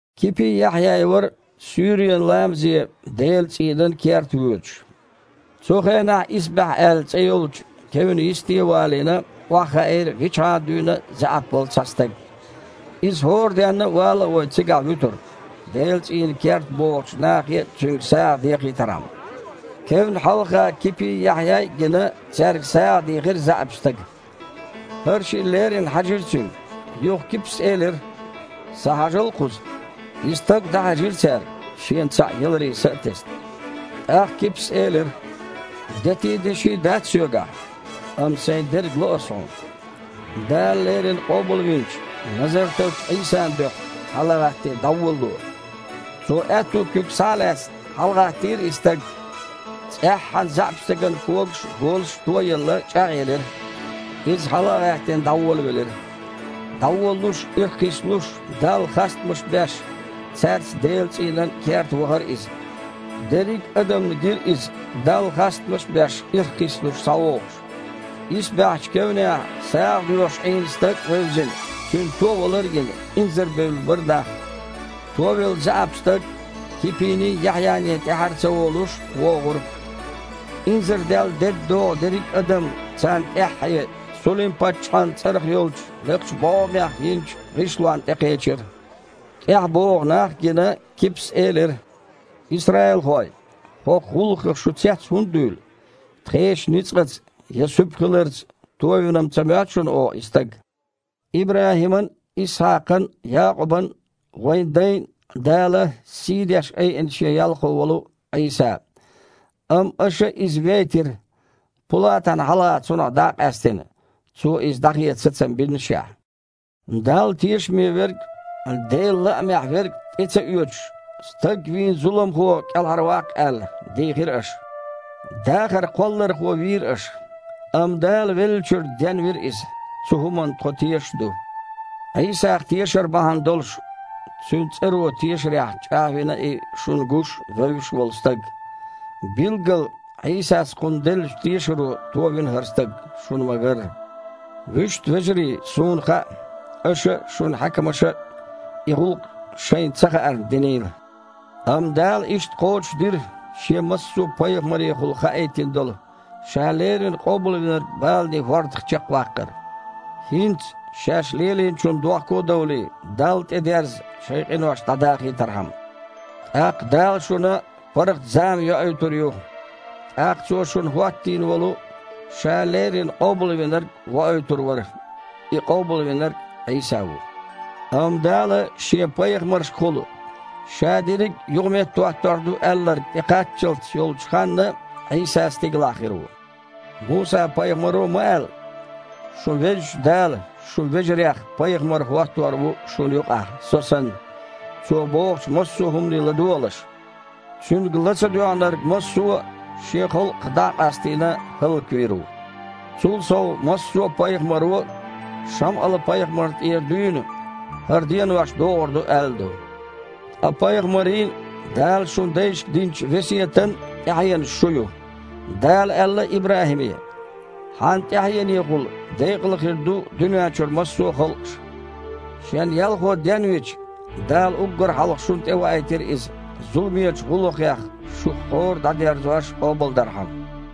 Кипий, Яхьъяй вара суьйренан ламазе Делан цІийнан керта воьдуш. Цу хенахь «Исбаьхьа» аьлла цІе йолчу кевнан йисте а валийна, охьахаийра вичхьана дуьйна а заьІап волу цхьа стаг. Иза хІора денна а, вала а вой, цигахь вуьтура, Делан цІийнан керта богІучу нахе цуьнга сагІа дехийтархьама. Кевнна хьалха Кипий, Яхьъяй а гина, цаьрга сагІа дийхира заьІапчу стага. ХІара шиъ леррина хьаьжира цуьнга. Юха Кипас элира: «Схьахьажал кхуза!» И стаг дІахьаьжира цаьрга, шена цхьаъ яларе са а тесна. ТІаккха Кипас элира: «Дети а, деши а дац соьгахь, амма сайн дерг ло ас хьуна. Дала леррина Къобалвинчу, Назартарчу Іийсан дуьхьа, хьала а гІаттий, дІаволало!» Цо, аьтту куьг схьа а лаьцна, хьалагІаттийра и стаг. ЦІеххьана заьІапчу стеган когаш а, голаш а то а елла, чІагІъелира. Иза, хьала а гІаьттина, дІаволавелира. ДІаволалуш, ирхкхиссалуш, Далла хастамаш беш, цаьрца Делан цІийнан керта вахара иза. Дерриг а адамна гира иза, Далла хастамаш а беш, ирхкхиссалуш, схьавогІуш. «Исбаьхьчу» кевнехь сагІадоьхуш Іийна стаг а вевзина, цуьнан товалар а гина, инзарбевлла бара нах. Товелла заьІап стаг, Кипиний, Яхьъяний тІаьхьара а ца волуш, вогІура. Инзардаьлла дедда догІу дерриг а адам царна тІаьххье Сулим-паччахьан цІарах йолчу лекхачу бІогІамех йинчу гІишлонна тІекхечира. ТІаьхьа богІу нах а гина, Кипас элира: «Исраилхой, хІокху гІуллакхах шу цец хІунда дуьйлу? Тхешан ницкъаца я суьпа хиларца товина-м ца моьтту шуна оха и стаг? ИбрахІиман а, Исхьакхан а, Якъубан а, вайн дайн а Дала сийдеш айина Шен ялхо волу Іийса. Амма аша Иза вейтира, Пулатана хьалха Цунах дІа а къаьстина, цо Иза дІахеца сацам биннашехь а. Далла тешаме Верг а, Делан лаамехь Верг а тІе ца оьцуш, стаг вийна зуламхо кІелхьарваккха аьлла, дийхира аша. Дахар Кхоллархо вийра аша! Амма Дала веллачуьра денвира Иза, цу хІуманна тхо тешаш а ду. Іийсах тешар бахьана долуш, Цуьнан цІаро тешарехь чІагІвина и шуна гуш а, вевзаш а волу стаг. Билггала, Іийсас кхунна деллачу тешаро товина хІара стаг, шуна ма-гарра. Вуьшта, вежарий, суна хаьа, аша а, шун хьаькамаша а и гІуллакх шайна ца хаарна динийла. Амма Дала иштта кхочушдира, Шен массо а пайхамарехула хаийтина долу, Ша леррина Къобалвинарг баланийн хІордах чекхваккхар. ХІинца, шаьш лелийначунна дохко а довлий, Далла тІедерза, шайн къинош дІадахийтархьама. ТІаккха Дала шуна паргІат зама йоуьйтур ю. ТІаккха Цо шуна хІоттийна волу, Ша леррина Къобалвинарг воуьйтур вара. И Къобалвинарг Іийса ву. Амма Дала Шен пайхамаршкахула Ша дерриг а юхаметтахІоттор ду аьлларг тІекхаччалц йолчу ханна Іийса стигалахь хир ву. Муса-пайхамаро а ма аьлла: „Шун Везачу Дала, шун вежарех Пайхамар хІоттор ву шуна юкъахь, со санна. Цо бохучу массо а хІумане ладогІалаш. Цуьнга ла ца доьгІнарг массо а, шен халкъах дІа а къастийна, хІаллаквийр ву“. Цул сов, массо а пайхамаро, Шамъал-пайхамарна тІера дуьйна, хІара денош догІур ду аьлла ду. Ткъа пайхамарийн а, Дала шун дайшка динчу весетан а тІаьхьенаш шу ю. Дала аьлла ИбрахІиме: „Хьан тІаьхьенехула декъала хир ду дуьнен чуьра массо а халкъаш“. Шен Ялхо денвича, Дала уггар хьалха шуна тІеваийтира Иза, зуламечу гІуллакхех шух хІора а дІадерзош, къобалдархьама».